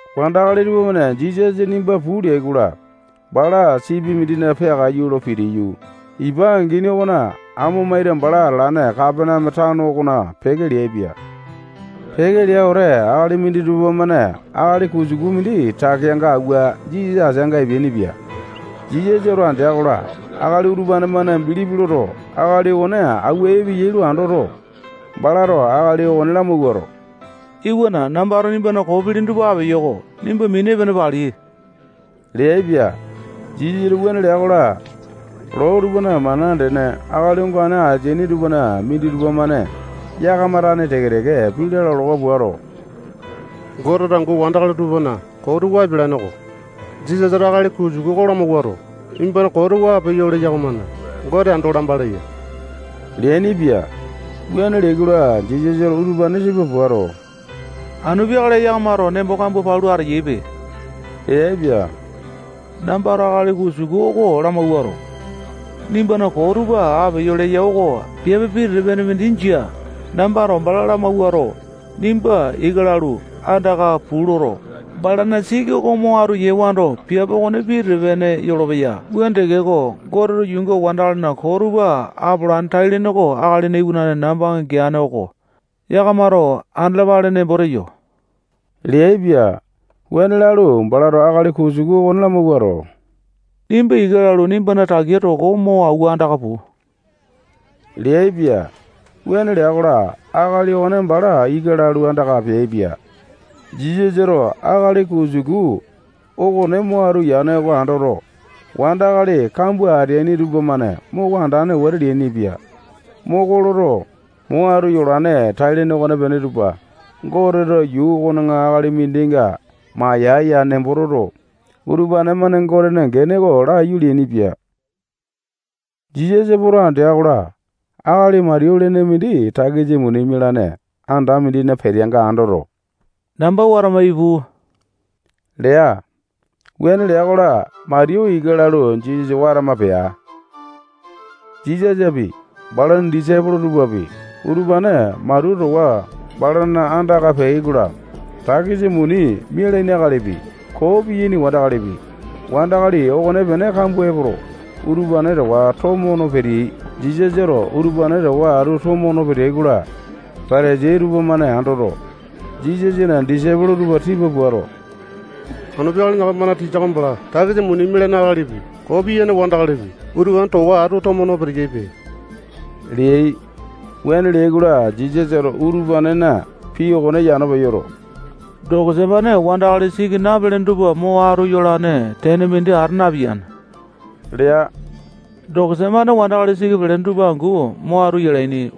Wandakali tupamane Jisasa nimba puu leai-kola, bala sipi mindina peakaiyu lo pitiyu, ipa angini okona amo maita bala atalane Kapaneame tano okona peke leaipia. Peke lea wete, akali minditupa-mane akali kusuku mindi takeanga awua Jisasa ateanga epeainipia. Jisasato andea-kola, akali utupane-mane bilipi loto, akali okone awua epeyai lo andoto, balato akali okone lamawuato, iwana, nambato nimbana koo pilini tupa apeyo-ko. Nimba mini epene pali leaipia. Jisasato wuane lea-kola, loo tupana mana andene akali ongane ateaini tupana minditupa-mane yakama tane teke-teke pii lalawa puato, Goteto angu wandakali tupana koo tupa apialane-ko. Jisasato akali kusuku oko lamawuato, nimbana koo tupa apeyo leya okomane Gote ando lamba leya leainipia. Wuane leai-kola, Jisasato utupane tipa puato, anu peakale yakamato nembo koo palu ateyaipe leaipia. Nambato akali kusuku oko lamawuato, nimbana koo tupa apeyo leyo oko piape pitete-pene mindi jia. Nambato bala lamawuato, nimba ika lalu, andaka puu loto, balana siki oko mo atu yewando, piape okone pitete-pene yolopeya. Wuane tekeko, Goteto yuunga wandakalina koo tupa apolane tai-lene oko Akalina Iwanane nambanga geane oko yakamato andalapale nembo teyo leaipia. Wuane lalu, balato akali kusuku okone lamawuato, nimba ika lalu, nimbana takea toko mo awua andaka puu, leaipia. Wuane lea-kola, akali okone bala ika lalu, andaka peaipia. Jisasato akali kusuku okone mo atu yane oko andoto, wandakali kambua ateaini tupamane moko andane wete leainipia. Moko loto, mo atu yolane tai-lene okonepene tupa Goteto yuu okona akali mindinga mayae-ya nembo toto, utupane-mane Gotena gene oko laiyu leainipia. Jisasa poto andea-kola, akali Matiyu lene mindi takisa muni mialaini anda mindina peteanga andoto, namba watama ipu lea. Wuane lea-kola, Matiyu ika lalu, Jisasa watama pea. Jisasapi, balana disaipolo tupapi, utupane Matiyu towa atu balana andaka peai-kola, takisa muni mialaini akalipi, koo piyaini wandakalipi, wandakali okonepene kambua epoto, utupane towa atu tomo no peteai. Jisasato utupane towa atu tomo no peteai-kola, Patasai tupamane andoto, Jisasana disaipolo tupa tipa puato, anu peakale yakamana tisa oko bala takisa muni mialaini akalipi, koo piyaini wandakalipi, utupane towa atu tomo no peteyaipe leai. Wuane leai-kola, Jisasato utupanena pii okone yano peyoto, dokosa-mane wandakali siki napalene tupa mo atu yolane tene mindi ata napeya lea. Dokosa-mane wandakali siki pelene tupa angu mo atu yalaini.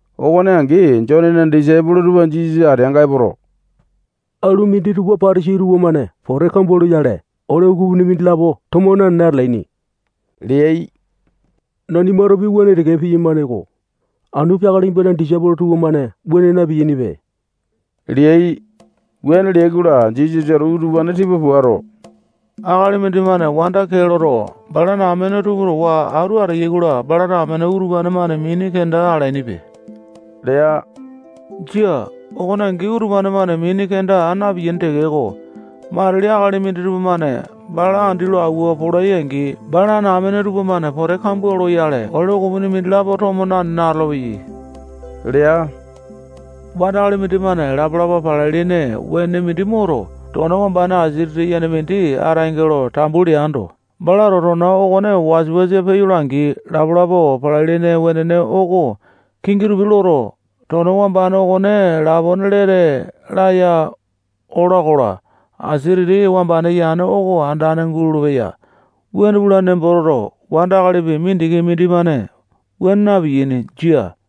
Okone angi, Jonena disaipolo tupa Jisasa ateanga epoto, alu minditupa Patasai tupamane pote kambua loyale, ole ukupini mindilapo tomo nanene atalaini leai. Nanimatopi wuane teke piyamane-ko. Anu peakale nimbana disaipolo tupamane wuane na-piyainipe leai. Wuane leai-kola, Jisasato utupane tipa puato, akali mindimane wanda mindi kee loto, balana amene tupa towa atu ateyai-kola, balana amene utupane-mane mini kenda alainipe lea. Jia. Okone angi utupane-mane mini kenda aa na-piyaini tekeko, matili akali minditupa-mane bala andi lo awua polai-angi, balana amene tupamane pote kambua loyale, ole ukupini mindilapo tomo nanene atolopeyai lea. Wandakali mindimane lapa-lapa palai-lene wenene mindi moto, tona wambane asia titi yene mindina ataenge lo tambu leando, balato tona okone wasa-wasa peyola-angi, lapa-lapa palai-lene wenene oko kingi tupi loto, tona wambane okone lapone lete laya ola-kola, asia titi wamba yane okone andane gulolo-peya. Wuane pulane nembo toto, wandakali mindikipi mindimane wuane napiyane. Jia.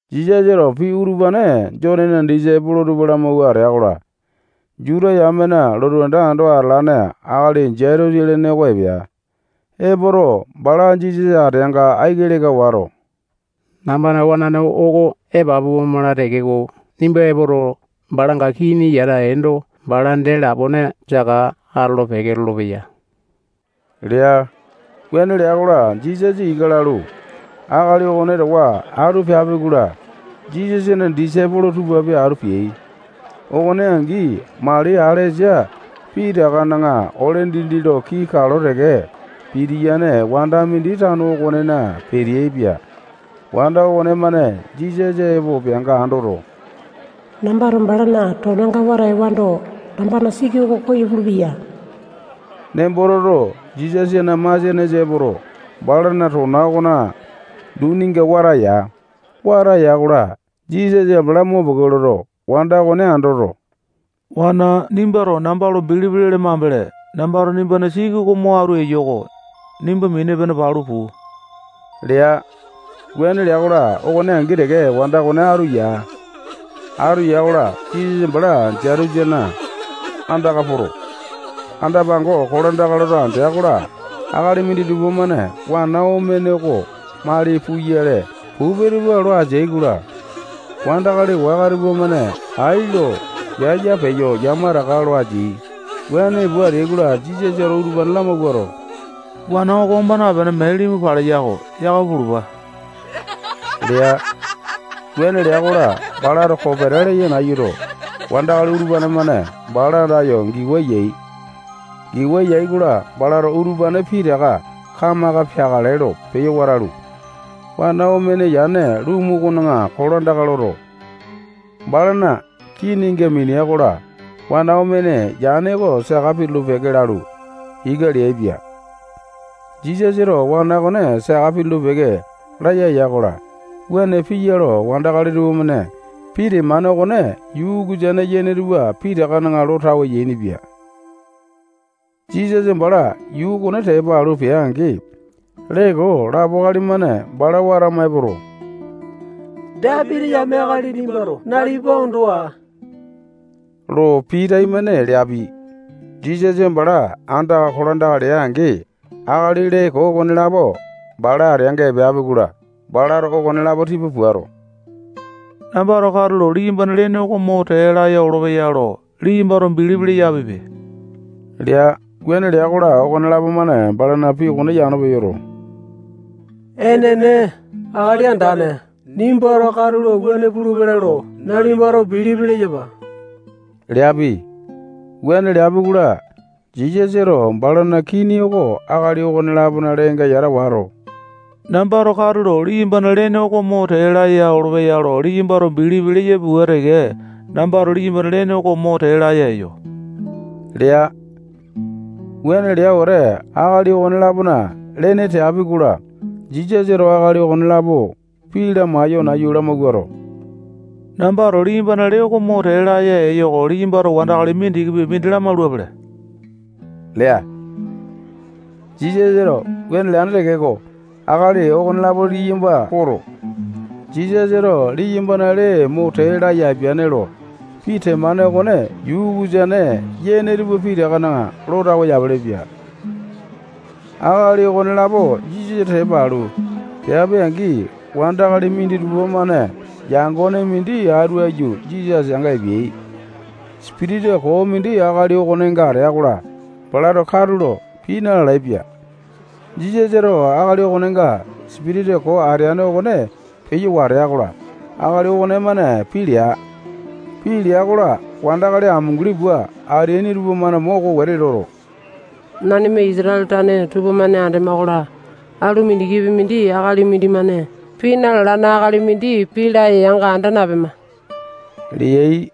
Jisasato pii utupane Jonena disaipolo tupa lamawua atea-kola, Juta yamena lotu anda ando atalane akali Jaitusa lene oko epea. Epoto, bala Jisasa ateanga aiki leka wato, nambana wanane oko epapu omala tekeko, nimba epoto, balanga kini yata eendo, bala dee lapone saka atolo-peke lolopeya lea. Wuane lea-kola, Jisasa ika lalu, akali okone towa atu peapi-kola, Jisasana disaipolo tupapi atu peai. Okone angi, mali alesa pitakana ole dindi lo kii kalo teke pitiyane wanda mindi tano okonena peteaipia. Wanda okonemane Jisasa epo peanga andoto, nambato balana tonanga wata ewando, nambana siki oko koyo pulupeya nembo toto, Jisasana masianesa epoto, balana tona okona duninga wata ya. Wata ya-kola, Jisasa bala mopeke loto, wanda okone andoto, wana nimbato namba lo bilipi lele mambele, nambato nimbana siki oko mo atu eyo-ko. Nimba mini epene palu puu lea. Wuane lea-kola, okone angi teke wanda okone atu ya. Atu ya-kola, Jisasa bala Jaitusa okona andaka poto, anda-pango kolandaka loto andea-kola, akali minditupa-mane wana omene oko mali puyale pupe tupa lo ateai-kola, wandakali waka tupamane ai lo yaya peyo yamataka lo ateai. Wuane pua ateai-kola, Jisasato utupane lamawuato, wana oko oma napene, mee limu paleya-ko. Yakama pulupa lea. Wuane lea-kola, balato kopeta leya nayuto, wandakali utupane-mane bala andayo giwa yai. Giwa yai-kola, balato utupane pitaka kamaka peakale lo peyo watalu, wana omene yane lumu okona kolandaka loto, balana kininga minia-kola, wana omene yane oko saka pitulu-peke lalu, ika leaipia. Jisasato wana okone saka pitulu-peke laya ya-kola, wuane piya lo wandakali tupamane pii temane okone yuu ukusane yene tupa pitakana lo tawe yainipia. Jisasa bala yuu okone tepa alu pea-angi, lee koo lapo akali-mane bala watama epoto, Dapiti yame akali nimbato nalipa ondo aa lo pii taimane leapi. Jisasa bala andaka kolandaka lea-angi, akali lee koo okonelapo bala ateanga epeapi-kola, balato okonelapo tipa puato, nambato katulo liyambana lene mo tee laya olopeya lo liyambato bilipi leyapipe lea. Wuane lea-kola, okonelapo-mane balana pii okone yano peyoto, enene, Akali Andane, nimbato katulo wuane pulupele lo nalipato bilipi leyapa leapi. Wuane leapi-kola, Jisasato balana kini oko akali okone-lapona lenenga yata wato, nambato katulo liyambana lene oko mo tee laya olopeya lo liyambato bilipi leyapi pua teke, nambato liyambana lene oko mo tee laya eyo lea. Wuane lea wete, akali okone-lapona lene teapi-kola, Jisasato akali okonelapo pii lamaiyo nayu lamawuato, nambato liyambana lee mo tee laya eyo oko liyambato wandakali mindikipi mindi lamaulapele lea. Jisasato wuane leane tekeko, akali okonelapo liyamba poto, Jisasato liyambana lee mo tee laya apiane lo pii temane okone yuu ukusane yene tupa pitakana lo tawe yapelepia. Akali okonelapo Jisasa tepa alu, peapi-angi, wandakali minditupa-mane yangone mindi atu aiyu Jisasa ateanga epeai. Sipitisa koo mindi akali okonenga atea-kola, balato katulo pii na-lalaepia. Jisasato akali okonenga sipitisa koo ateane okone peyo watea-kola, akali okonemane pii lea. Pii lea-kola, wandakali amunguli pua ateaini tupamane moko wete loto, nanima Isatale tane tupamane andema-kola, alu mindikipi mindi akali mindimane pii na-lalane akali mindi pii laya yanga anda napema leai.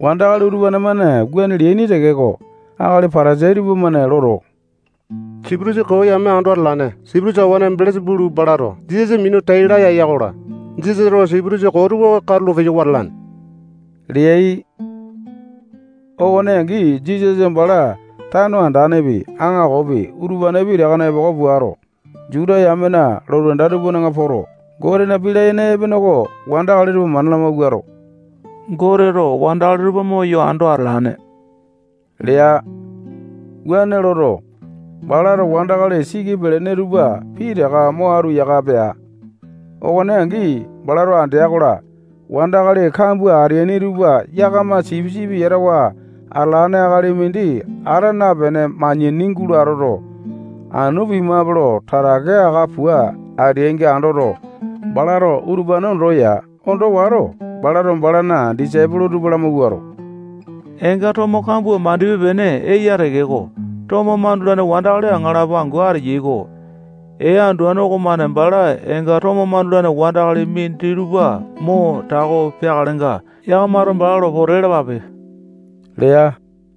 Wandakali utupane-mane wuane leaini tekeko, akali Patasai tupamane loto, sipitisa koo yame ando atalane sipitisa kawane Belesa-pulu balato Jisasa minu tai laya eya-kola, Jisasato sipitisa koo tupa katulo peyo wata alane leai. Okone angi, Jisasa bala tano andanepi, aŋakopi, utupane pitakana epoko puato, Juta yamena lotu anda tupana poto, Gotena pii layene epene oko wandakali tupa mana lamawuato, Goteto wandakali tupa moyo ando atalane lea. Wuane loto, balato wandakali siki pelene tupa pitaka mo atu yaka pea. Okone angi, balato andea-kola, wandakali kambua ateaini tupa yakama sipisipi yatawa atalane akali mindi ata napene manyani gulo atoto, anu pimape lo tatake aka pua ateaininga andoto, balato utupane ondo ya. Ondo wato, balato balana disaipolo tupa lamawuato, eenga tomo kambua mandipe-pene eya tekeko, tomo mandulane wandakali aŋalapo angu ateyai-ko. Ee anduane okomane bala eenga tomo mandulane wandakali minditupa mo tako peakalenga, yakamato bala lo pote lalapape lea.